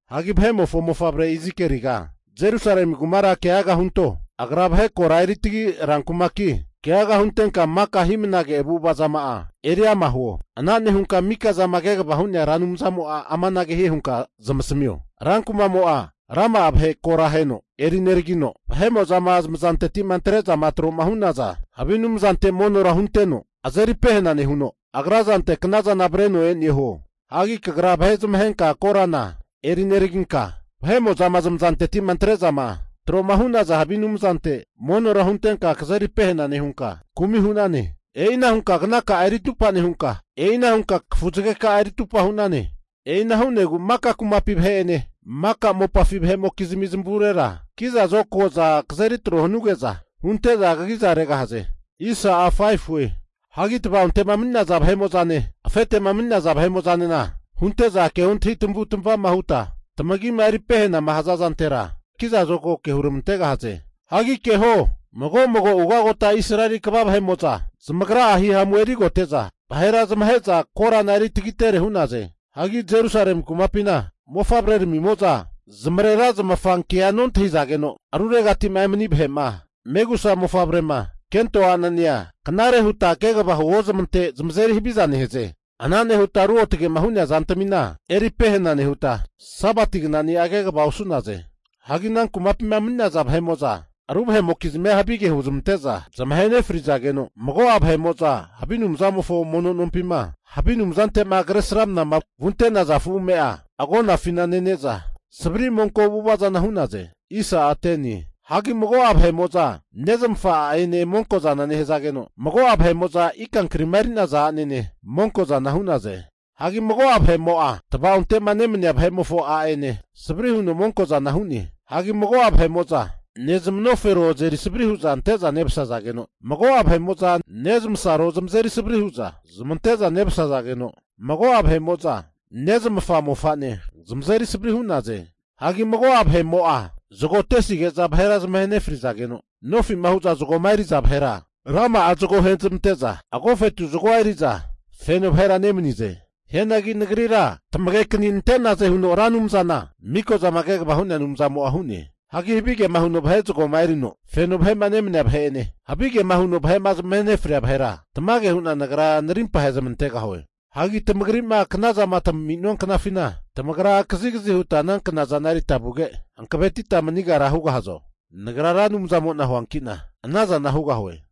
Vahe'mofo mofavre Izikeliga, Jerusalemi kumara keaga hunto. Agra vahe kora eritagi rankumaki, keaga huntenka maka hi'mnage avu'ava zama'a eri ama huo. Ana nehunka Mikozama kegava hu'nea Anumzamo'a amanage hie hunka zamasamio, Rankumamo'a rama'a vahe kora aheno eri neragino, vahe'mo'zama zamazanteti'ma antre'zama tro'ma hu'naza havi anumzante monora hunteno azeri pehena nehuno agra zante knazana avreno e'ne huo. Hagi kagra vahe zamahenka korana eri neraginka, vahe'mo'zama zamazanteti'ma antre'zama tro'ma hu'naza havi anumzante monora huntenka kagra'a kazeri pehena nehunka kumi hu'nane. E'ina hunka knaka'a eri atupa nehunka, kafu zageka'a eri atupa hu'nane. E'ina hu'negu maka kumapi vahete'ene maka mopafi vahe'mokizmi zamavurera ki'za zokago'za kazeri tro hanuge'za hunte'za kagiza regahaze. Hagi tava'onte'ma mani'naza vahe'mo'zane, afete'ma mani'naza vahe'mo'zanena hunte'za keontahi tamavutamavama huta tamagima eri pehenama haza zantera zokago ke huramantegahaze. Hagi keho, mago mago ugagota Israeli kva vahe'mo'za zamagra'a hihamu erigote'za, vahera zamahe'za korana eri tagitere hu'naze. Hagi Jerusalemi kumapina mofavreramimo'za zamarera zamafankea nontahizageno, ruregati'ma emani vahe'ma, megusa mofavrema, kento a'nenea knare huta kegava huozmante zamazeri haviza nehaze. Ana nehuta ruotge'ma hu'nea zantamina eri pehana nehuta, Sabati knani'a kegava osu'naze. Hagi ana kumapima mani'naza vahe'mo'za ru vahe'mokizmia havige huzmante'za zamahe nefrizageno, mago'a vahe'mo'za havi anumzamofo mono nompima havi anumzante'ma Kresramanama vunte'naza afu ame'a agonafina nene'za savri monko avu'ava zana hu'naze. Hagi mago'a vahe'mo'za nezmafa a'ene monko'zana nehazageno, mago'a vahe'mo'za ika kri'ma eri'naza a'nene monkozana hu'naze. Hagi mago'a vahe'mo'a tavaonte'ma nemania vemofo a'ene savri huno monko'zana hu'ne. Hagi mago'a vahe'mo'za nezmanofero azeri savri hu'za ante'za nevasazageno, mago'a vahe'mo'za nezmasaro zamazeri savri hu'za zamante'za nemasazageno, mago'a vahe'mo'za nezmafa mofane zamazeri savrira hu'naze. Hagi mago'a vahe'mo'a zago atesige'za vahera zamahe nefrizageno, nofima hu'za zagoma eri'za vahera rama'a zago agi ahezmante'za agofetu zagoa eri'za feno vahera nemanize. Hianagi Nagrira tamagekani nante'naze huno Ra Anumzana Mikozama Kegavama Hu'nea Anumzamo'a hu'ne. Hagi havigema huno vahe zagoma erino feno vahe'ma nemania vahe'ene, havigema huno vahe'ma zamahe nefria vahera tamage hu'na Nagra narimpa ahezmantegahue. Hagi tamagri'ma knazama tami'nua knafina, tamagra kazigazi huta ana knazana erita vuge, hankavetita manigera hugahazo? Nagra Ra Anumzamo'na huanki'na ana zana hugahue.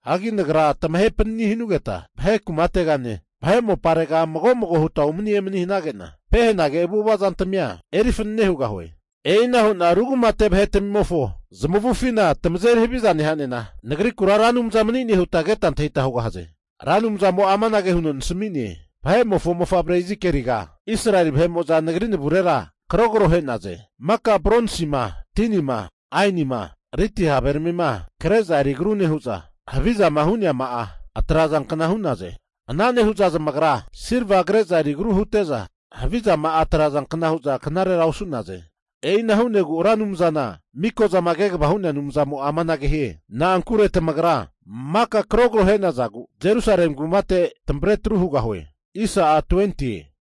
Hagi Nagra tamahe panani hanugeta vahe kumategane, vahe moparega mago mago huta umani emani hanage'na pehenage avu'ava zantamia eri fanane hugahue. E'ina hu'na ru kumate vahetamimofo zamavufina tamazeri haviza neha'nena, Nagrikura Ra Anumza mani'ne huta keta antahita hugahaze. Ra Anumzamo'a amanage huno nasami'ne, Vahe'mofo mofavre Izikieliga, Israeli vahe'mo'za Nagri navurera karogro ahe'naze. Maka bronsima, tinima, ainima, lidi haveramima kre'za eri agru nehu'za, havizama hu'neama'a atrazankna hu'naze. Ana nehu'za zamagra silva kre'za eri agru hute'za havizama'a atrazankna hu'za knarera osu'naze. E'ina hu'negu Ra Anumzana Miko'zama Kegavama Hu'nea Anumzamo'a amanage hie, Na'ankure tamagra maka karogro ahe'nazagu, Jerusalemi kumate tamavre atru hugahue.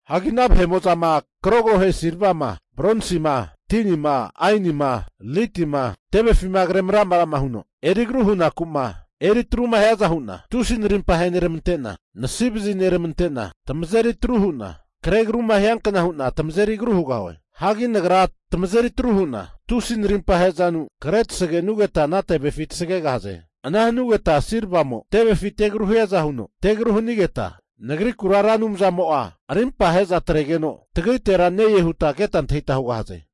Hagi vahe'mo'zama karogro ahe silvama, bronsima, tinima, ainima, lidima tevefima kre maramra huno eri agru hunaku'ma eri atruma hiaza hu'na, tusi narimpa aheneramante'na nasivazi neramante'na tamazeri atru hu'na kre agruma hiankna hu'na tamazeri haviza hugahue. Hagi Nagra tamazeri atru hu'na tusi narimpa ahe'zanu kre tasage'nugeta ana tevefi tasagegahaze. Ana hanugeta silvamo tevefi te agru hiaza huno te agru hanigeta, Nagrikura Ra Anumzamo'a arimpa ahe'za atregeno tagritera ne-e huta keta antahita hugahaze.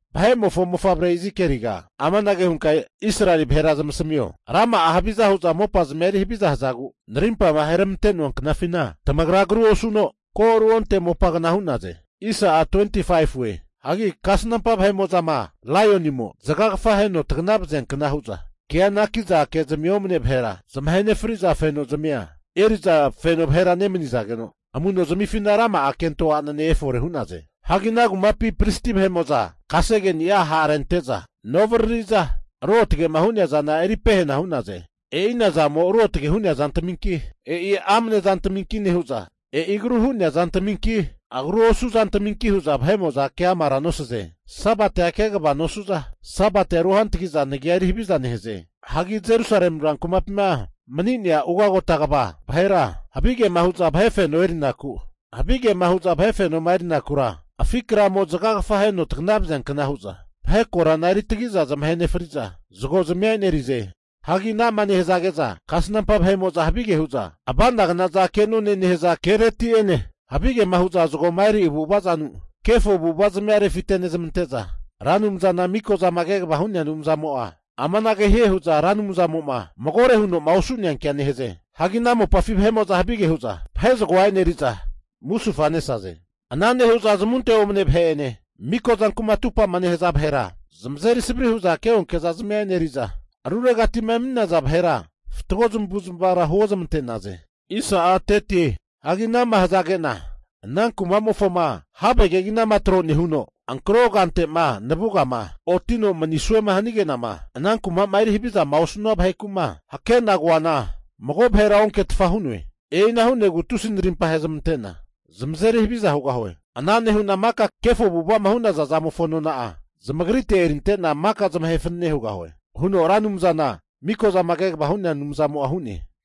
Vahe'mofo mofavre Izikieliga amanage hunka Israeli vahera zamasamio, rama'a haviza hu'za mopazmia eri haviza hazagu, Narimpama aheramante'noa knafina tamagra agru osuno ko ruonte mopagna hu'naze. Hagi kasnampa vahe'mo'zama laionimo zagagafa aheno tagana vaziankna hu'za kea anaki'za kezmi omne vahera zamahe nefri'za fenozmia eri'za feno vahera nemanizageno, amu'no zamifina rama'a kento a'ne erifore hu'naze. Hagi ana kumapi pristi vahe'mo'za kasege'ni'a ha'rente'za noviriri'za, ruotge'ma hu'nea zana eri pehena hu'naze. E'ina zamo ruotge hu'nea zantaminki, e'i amane zantaminki nehu'za, e'i agru hu'nea zantaminki, agru osu zantaminki hu'za vahe'mo'za keamara nosaze. Sabatia kegava nosu'za, Sabatia ru hantgi'za Nagi'a eri haviza nehaze. Hagi Jerusalemi rankumapima mani'naza ugagota kva vahe'mo'za, havigema hu'za vahe fenoma erinakura, afi' kramo zagagafa aheno tagna vaziankna hu'za vahe korana eri tagiza zamahe nefri'za zagozmia e'nerize. Hagi ana'ma nehazage'za kasnampa vahe'mo'za havige hu'za ava'nagnaza kenone nehaza kereti'ene, havigema huza zagoma eri avu'avazanu kefo avu'avazamia refite nezmante'za, Ra Anumzana Mikozama Kegava hu'nea Anumzamo'a amanage hie hu'za Ra Anumzamo'ma magore huno'ma osu'neankea nehaze. Hagi ana mopafi vahe'mo'za havige hu'za vahe zagoa e'neriza, musufa nesaze. Ana nehu'za zamunte omne vahe'ene, miko zanku'ma atupama nehaza vahera zamazeri savri hu'za keonke zazmia e'neriza, ruregati'ma emani'naza vahera fatgo zamavu'zmavara huozmante'naze. Hagi ana'ma hazage'na ana kuma'mofoma have keginama tro nehuno, ankro kante'ma navugama otino maniso hanige'nama ana kuma'ma eri havizama osanua vaheku'ma hake'na koana mago vahera onketfa hu'noe. E'ina hu'negu tusi narimpa ahezmante'na zamazeri haviza hugahue. Ana nehu'na maka kefo avu'ava'ma hu'naza zamofo nona'a zamagrite erinte'na maka zamahe fanane hugahue, huno Ra Anumzana Mikozama Kegava Hu'nea Anumzamo'a hu'ne.